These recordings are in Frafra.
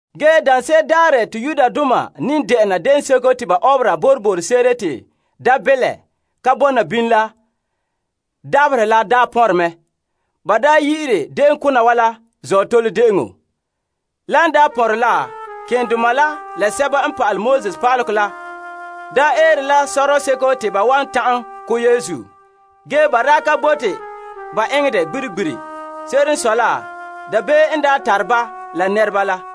Ge daanse'ere daarɛ te ba ne de'ena Boroboro N Ka Tare Mi'ihom De'eŋɔ la dabaherɛ la daa pɔnrɛ mɛ. Ba yi'ire de'eŋ kona wa la Azootole De'eŋɔ. Lan daa pɔnrɛ la, malema keema la pa'alegɔ pa'aleba la eere la sɔrɔɔ seko te ba wan ta'an ko' Yesu. Ge ba ka bote ba eŋɛ dɛ gbiri gbiri. Se'ere n sɔe la, dabeem n tare ba la nɛreba la.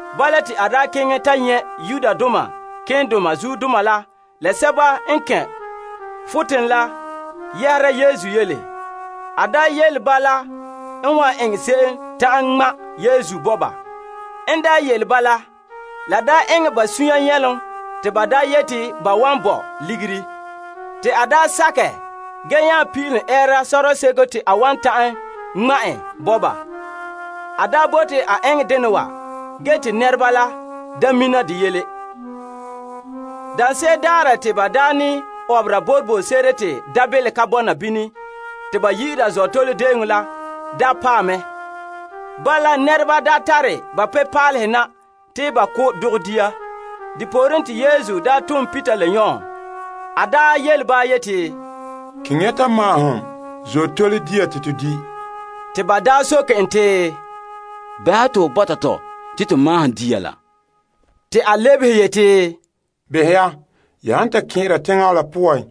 Bala te a keŋɛ ta nyɛ' malema keema la guruba la yɛhera Yesu yele. A daa yele ba la en wan eŋɛ se'em ta'an ŋma' Yesu bo ba. En daa yele ba la, la eŋɛ ba sunya nyɛlom te ba yeti ban wan bo ligiri. Te a sakɛ, ge nya pin'ilom ɛɛra sɔrɔɔ seko te a wan ta'an ŋma' en bo ba. A bote a eŋɛ dena wa ge te nɛreba la ka mina de yele. Daanse'ere daarɛ te ba ne de'ena Boroboro N Ka Tare Mi'ihom De'eŋɔ la daa paɛ mɛ. Bala te nɛreba daa tare ba Azootole pebila na te ba ko' dɔgɛ dia. Depooren te Yesu tom Peter la Yon yele ba yeti, Keŋɛ ya ta maahom Azootole De'eŋɔ dia te to di'. Te ba soke en te, Bɛha to ho bɔta tɔ te to maahom dia la? Te a lebehe yeti, Behɛ ya, ya han ta kɛn'ɛra teŋa la poan,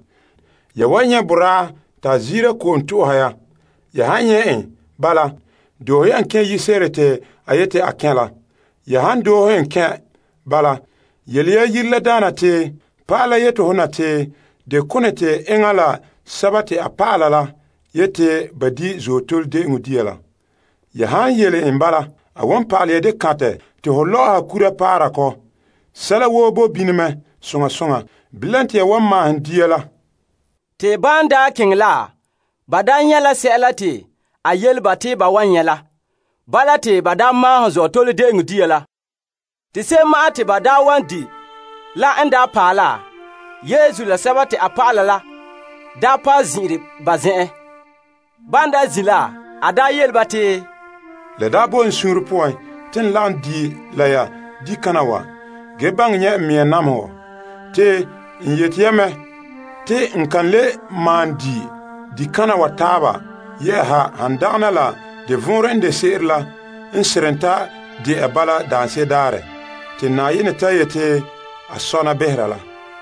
ya wan nyɛ' te boraa ta ziira kɔ'ɔn to'ohɛ ya. Ya han nyɛ' en bala, doohe ya en kɛn' yire se'ere ta a yete a kɛn' la. Ya han doohe en kɛn' bala, yele ya yire la daana te, Pa'ala la yete ho na te deo kone te enŋa Yesu la a dɔlɔba la yete ba di' Azootole De'eŋɔ dia la? Ya han yele en bala, a wan pa'alɛ ya deo kantɛ te ho lɔ'ɔha kora paara kɔ. Sɛla woo bo bini mɛ soŋa soŋa. Bilam te ya wan maahom dia la. Te ban keŋɛ la, ba nyɛ' la sɛla te a yele ba te ba wan nyɛ' la. Bala te ba maahom Azootole De'eŋɔ dia la. Te se'em ma'an te ba wan di' la n daa paɛ la, Yesu la a dɔlɔba la paɛ zin'ire ba zen'enhen. Ban zin' la, a yele ba te, La daa boe n suunre poan te n lagom di' la ya dikana wa ge baŋɛ nyɛ' n namehegɔ. Te n yete ya mɛ, te n kan le malom di' dikana wa taaba yɛ'ɛha han dagana la de vɔnrɛ n de se'ere la n seren ta de'a bala daanse'ere daarɛ te Na'ayenɛ ta yete a sɔna behera la.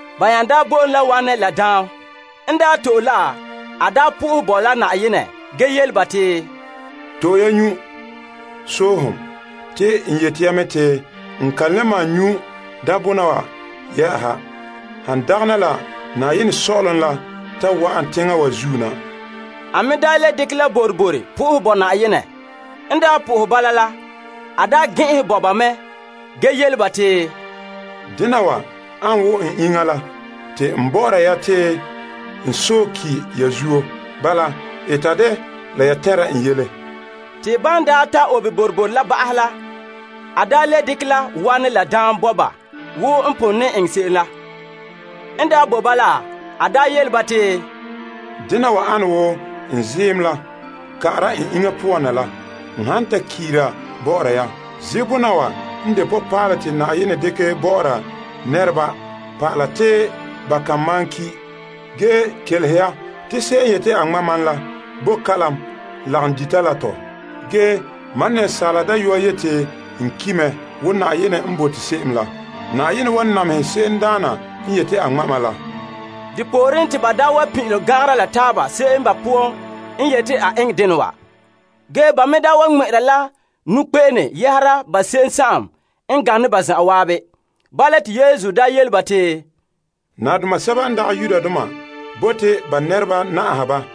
Ban nya bo en la wanɛ la daam, a to'e la ge bo Na'ayenɛ fara ge yele ba te, To'e ya nyu' sohom. Te n yete ya mɛ te n kan le malom nyu' daambona wa yɛ'ɛha, han dagana la Na'ayenɛ Sɔ'ɔlom n ta wa'an teŋa wa zuo na. A me le dekɛ la boroboro bo Na'ayenɛ fara ge gɛn'ɛnhɛ bo ba me ge yele ba te, Dena wa an wo n iŋa la te n bɔ'ɔra ya te n sɔe ki' ya zuo. Bala, eta dɛ la ya tɛnra n yele. Te a daa le dekɛ la wanɛ la daam bo ba wo n pon eŋɛ ne se'em la. N daa bo ba la, a daa yele ba te, Dena wa ane wo n ziim la ka'ara bɔ'ɔra ya. Ziim bona wa n de Na'ayenɛ nɔbiŋere paalɛ bɔ'ɔra nɛreba pa'ala te ba kan malom ki'. Ge kelehe ya te se'em n yete a ŋma' mam la bo kalam lagom dita la tɔ. Asaala Dayɔa yete n ki' mɛ wo Na'ayenɛ n bote se'em la. Ge Na'ayenɛ wan namehɛ se'emdaana n yete a ŋma' mam la. Depooren te ba pin'ilom gangara la taaba se'em ba poan n yete a eŋɛ dena wa. Ba me daa wa ŋmɛ'ɛra la nɔkpe'ene yɛhera ba se'em n gane ba zan'an. Bala te Yesu yele ba te, Nadoma sɛba n dagɛ Yudoma bote ba nɛreba na'aha ba,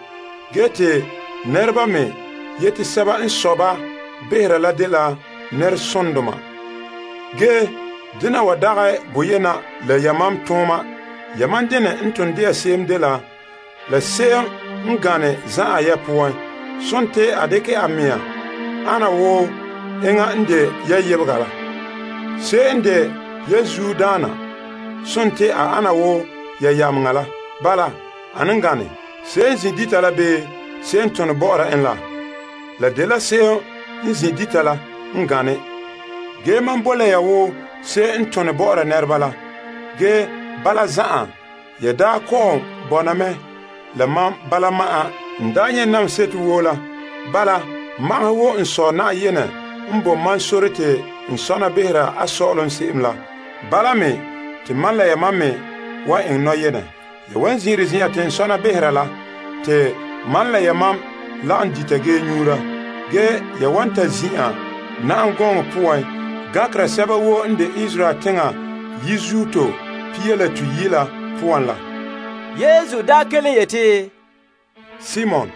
ge te nɛreba me yete sɛba n sɔe ba behera la dela nɛresondoma. Ge, dena wa dagɛ boyena la yamam tooma. Yamam denɛ n ton de'a se'em dela se'em n gane zan'an ya poan, sontii a dekɛ a mea an wo enŋa n de ya yebega la. Se'em n de ya zuodaana sontii a ana wo ya yameŋa la. Bala, ane n gane? Se'em n zin' dita la bii se'em n tone bɔ'ɔra en la? Se'em n zin' dita la n gane. Ge mam boe la ya wo se'em n tone bɔ'ɔra nɛreba la. Ge bala zan'an ya daa kɔ'ɔn bɔna mɛ la ma bala mam n daa nyɛ' namehe seto woo la. Bala, magahɛ wo n Sɔ' Na'ayenɛ n bo mam sore te n sɔna behera a Sɔ'ɔlom se'em la, bala me te mam la yamam wan sɔna behera. Ya wa zin'ire zen'an te n sɔna behera la te mam la yamam lagom dita ge nyuura. Ge ya wan ta zin'an na'am gɔŋɔ poan gankera sɛba woo n de Israel teŋa yizuto pia la toyi' la poan la. Yesu kelom yeti, Simon!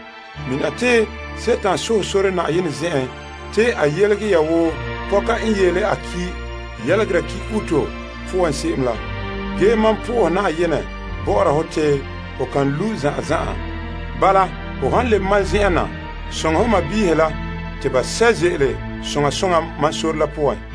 Mina te Dima sohɛ sore Na'ayenɛ zen'en te a yelege ya wo pɔka n yeele a ki yelegera ki uto poan. Ge mam sohɛ Na'ayenɛ bɔ'ɔra hɔ te ho kan lu' zan'an zan'an. Bala hon lebe mam zen'en na, soŋɛ ho sɔɔnrɔ la te ba sɛ' ze'ele soŋa soŋa mam sore la poan.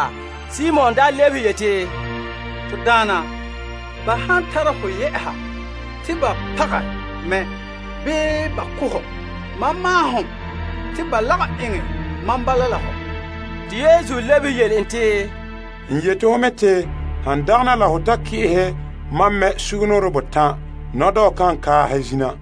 Simon Peter lebehe yeti, To Daana, ba han tara ho yɛ'a te ba pagɛ mɛ bii ba ko' hɔ, mam maahom te ba lagom eŋɛ mam bala la hɔ! Yesu lebehe en te, N yete ho mɛ te han dagana la ho ta ki'ehɛ mam mɛ sugumnɔɔren botan', nɔdɔɔ kan kaahɛ zina.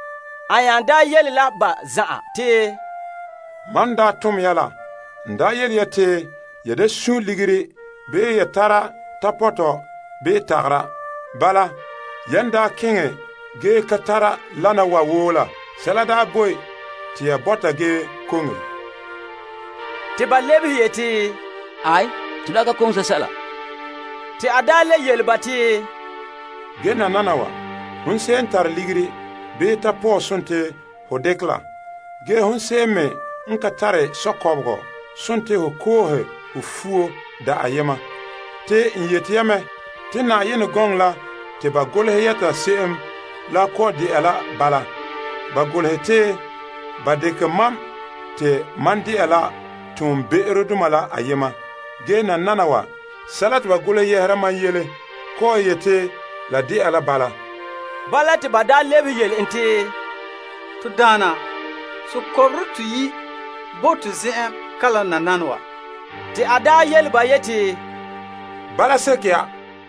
A nya yele la ba zan'an te, Mam n daa tom ya la, n daa yele ya te ya da sun' ligiri, bii ya tara tapɔtɔ, bii tagara. Bala yan daa keŋɛ ge ka tara lana wa woo la, sɛla daa boe te ya bɔta ge koŋe? Te ba lebehe yeti, Aai, to daa ka koŋe sɛla. Te a le yele ba te, Ge nananawa, hon se'em n tare ligiri, bii tapɔɔ sontii ho dekɛ la. Ge te hon se'em me n ka tare sukɔbegɔ sontii ho koohe ho fuo da' ayema. Te n yete ya mɛ, te Yenɛ gɔŋɔ la te ba golehɛ yɛta se'em la kɔ'ɔn de'a la bala. Ba golehɛ te, Ba kaanlɛ en pa'ahe la tobekperegadoma poan, Ge nananawa, sɛla te ba golehɛ yɛhera mam yele kɔ'ɔn yete la de'a la bala. Bala te ba lebehe yele en te, To Daana, sukɔbɔrɔ toyi' boe to zen'en kalam nananawa. Te a yele ba yeti, Bala seke ya.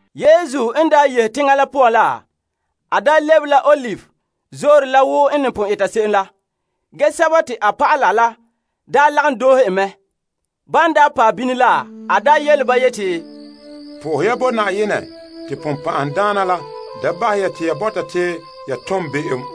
Yesu yehe teŋa la poan la, a lebe la Olive Zoore la wo n ne pon eta se'em la. Ge a dɔlɔba la lagom doohe en mɛ. Ban paɛ bini la, a yele ba yeti, Sohɛ ya Na'ayenɛ te Dima la da bahɛ ya te ya bɔta te ya tom be'em.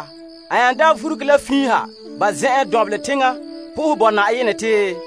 A nya daa vuruge la fiin ha ba zen'en dɔnbelɛ teŋa, sohɛ Na'ayenɛ te,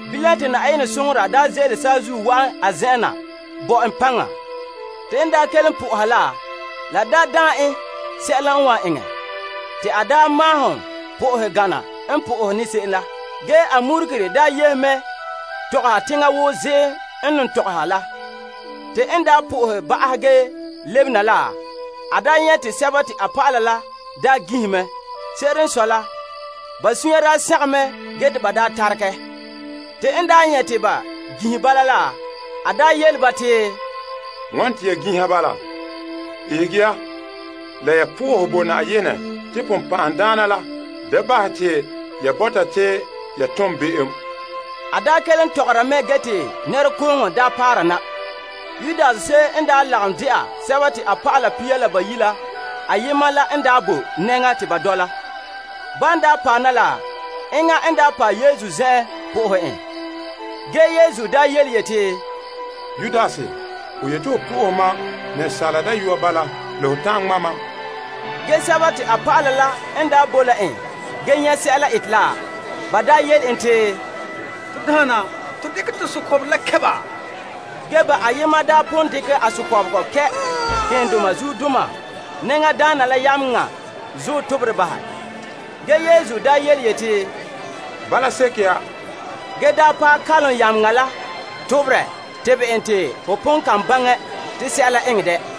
Bilam te Na'ayenɛ soŋora daa ze'ele saazuo wa'an a zen'en na bo en paŋa. Te en kelom sohora la daa daane en sɛla n wan eŋɛ. Te a malom sohɛ gana n po'ohɛ ne se'em la. Ge a murugere yehe mɛ tɔgɔhe teŋa wo ziim n ton tɔgɔha la. Te en sohɛ ba'ahɛ ge lebena la, a nyɛ' te a dɔlɔba la ginhe mɛ. Se'ere n sɔe la, ba suunre sagom te ba taregɛ. Te a yele ba te, Wane te ya ginha bala? Ihege ya la ya sohɛ Na'ayenɛ te Dima la da bahɛ ya te ya bɔta te ya tom be'em. A kelom tɔgɔra mɛ ge te nɛrekooŋɔ daa paara na. Yudas se'em n daa lagom de'a a dɔlɔba pia la bayi' la poan ayema la n bo nɛŋa te ba dɔla. En paɛ Yesu zen'en po'ohɛ en. Ge Yesu yeti, Yudas, ho yete ho po'ohɛ Asaala Dayɔa bala la ho ta'an ŋma' mam? A dɔlɔba la n boe la en ge nyɛ' sɛla ete la, ba yele en te, To Daana, to dekɛ to sukɔbɔrɔ la kɛ' ba? Ba ayema nya pon dekɛ a sukɔbegɔ kɛ' malema nɛŋadaana la yameŋa zuɔ toberɛ bahɛ. Ge Yesu yeti, Bala seke ya! Te a paɛ kalom yameŋa la toberɛ tebɛ en.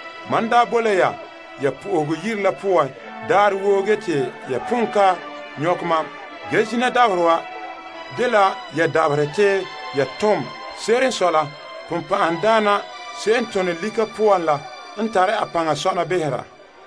Mam daa bo la ya ya Yenɛ Yire la poan daarɛ woo ge te ya pon ka nyɔkɛ mam. Ge zina dabaherɛ wa dela ya dabaherɛ te ya tom. Se'ere n sɔe la, Dima se'em n tone lika poan la n tare a paŋa sɔna behera.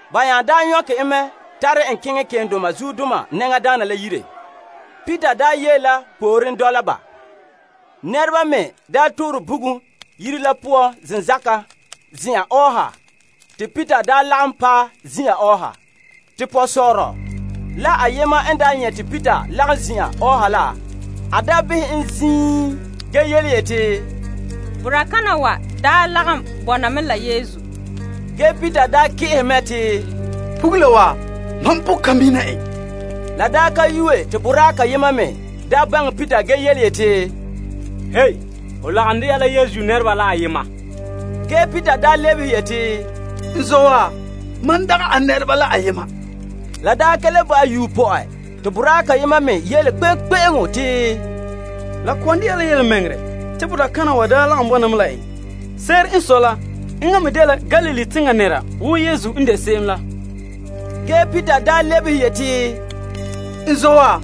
Ba nya daa nyɔkɛ en mɛ tare en keŋɛ malema nɛŋadaana la yire. Peter yee la pooren dɔla ba. Nɛreba me n toorɛ bugum yire la poan zenzakan zin'an ɔɔha te Peter lagom paɛ zin'an ɔɔha. Te pɔgɔsɔɔrɔ la ayema n nyɛ' te Peter lagom zin'an ɔɔha la, a behɛ en ziin ge yeti, Boraa kana wa daa lagom bɔna mɛ la Yesu. Ge Peter ki'ehe mɛ te, Pugula wa, mam pon ka mina en. La ka yuue te boraa kayema me baŋɛ Peter ge yeti, Ho lagom dɛna la Yesu nɛreba la ayema. Ge Peter lebehe yeti, N zɔ' wa, mam dagɛ a nɛreba la ayema. La ka le ba' yuue te boraa kayema me yele kpe'eŋkpe'eŋo te, La kɔ'ɔn de'a la yelemɛŋɛrɛ te boraa kana wa daa lagom bɔna mɛ la en. Se'ere n sɔe la, enŋa me dela Galilee teŋa nɛra wo Yesu n de se'em la. Ge Peter le lebehe yeti, N zɔ' wa,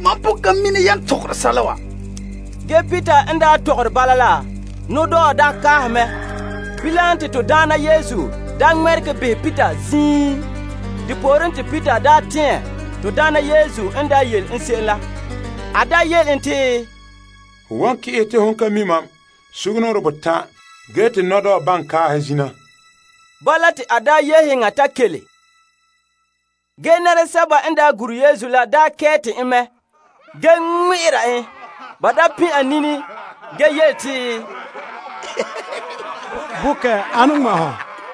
mam pon ka mi' yan tɔgɛ sɛla wa. Ge Peter n tɔgɔre bala la, nɔdɔɔ kaahɛ mɛ. Bilam te to Daana Yesu ŋmɛregɛ behɛ Peter ziin. Depooren te Peter tɛɛn to Daana Yesu n daa yele en se'em la. A daa yele en te, Ho wan ki'ehɛ te hon ka mi' mam sugumnɔɔren botan' ge te nɔdɔɔ baŋɛ kaahɛ zina. Bala, te a yehe yeŋa ta kele. Ge nɛresɛba n daa gure Yesu la kɛɛte en mɛ ge ŋmɛ'ɛra en. Ba pin' a nini ge yele te, Bokɛ ane n ŋmɛ' hɔ?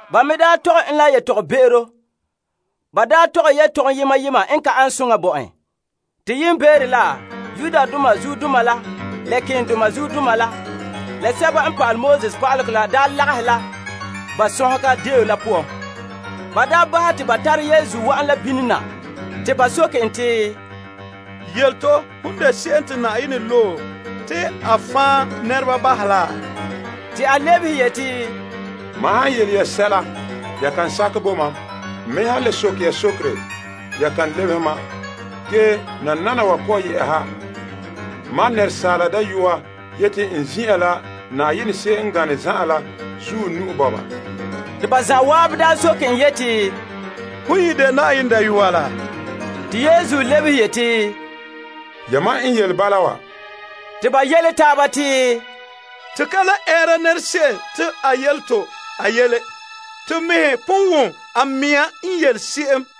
Ba me tɔgɛ en la yetɔgɔbe'ero yema yema bo en. Te yiimbeere la, zuodoma la malema keendoma la pa'alegɔ pa'aleba la daa lagahɛ la Yetɔgom Tɔgɔrɔba zen'an la. Ba bahɛ te ba tare Yesu wa'an la bini na te ba soke en te, Yele to, hon de se'em te Na'ayenɛ loe te a fan' nɛreba bahɛ laa? Te a lebehe yeti, Mam han yele ya sɛla, ya kan sakɛ bo mam. N me han le soke ya sokere, ya kan lebehe mam. Ge nananawa kɔ'ɔn yɛ'ɛha, Asaala Dayɔa yete n zin'an la Na'ayenɛ se'em n gane zan'an la zuɔ nu'o. Te ba zan'an soke en yeti, Hon ye de Na'ayenɛ Dayɔa laa? Te Yesu lebehe yeti, Yamam n yele bala wa. Te ba yele taaba te, To ka le ɛɛra nɛra se'em te a yele to a yele. To mɛhe pon wom a mea n yele se'em.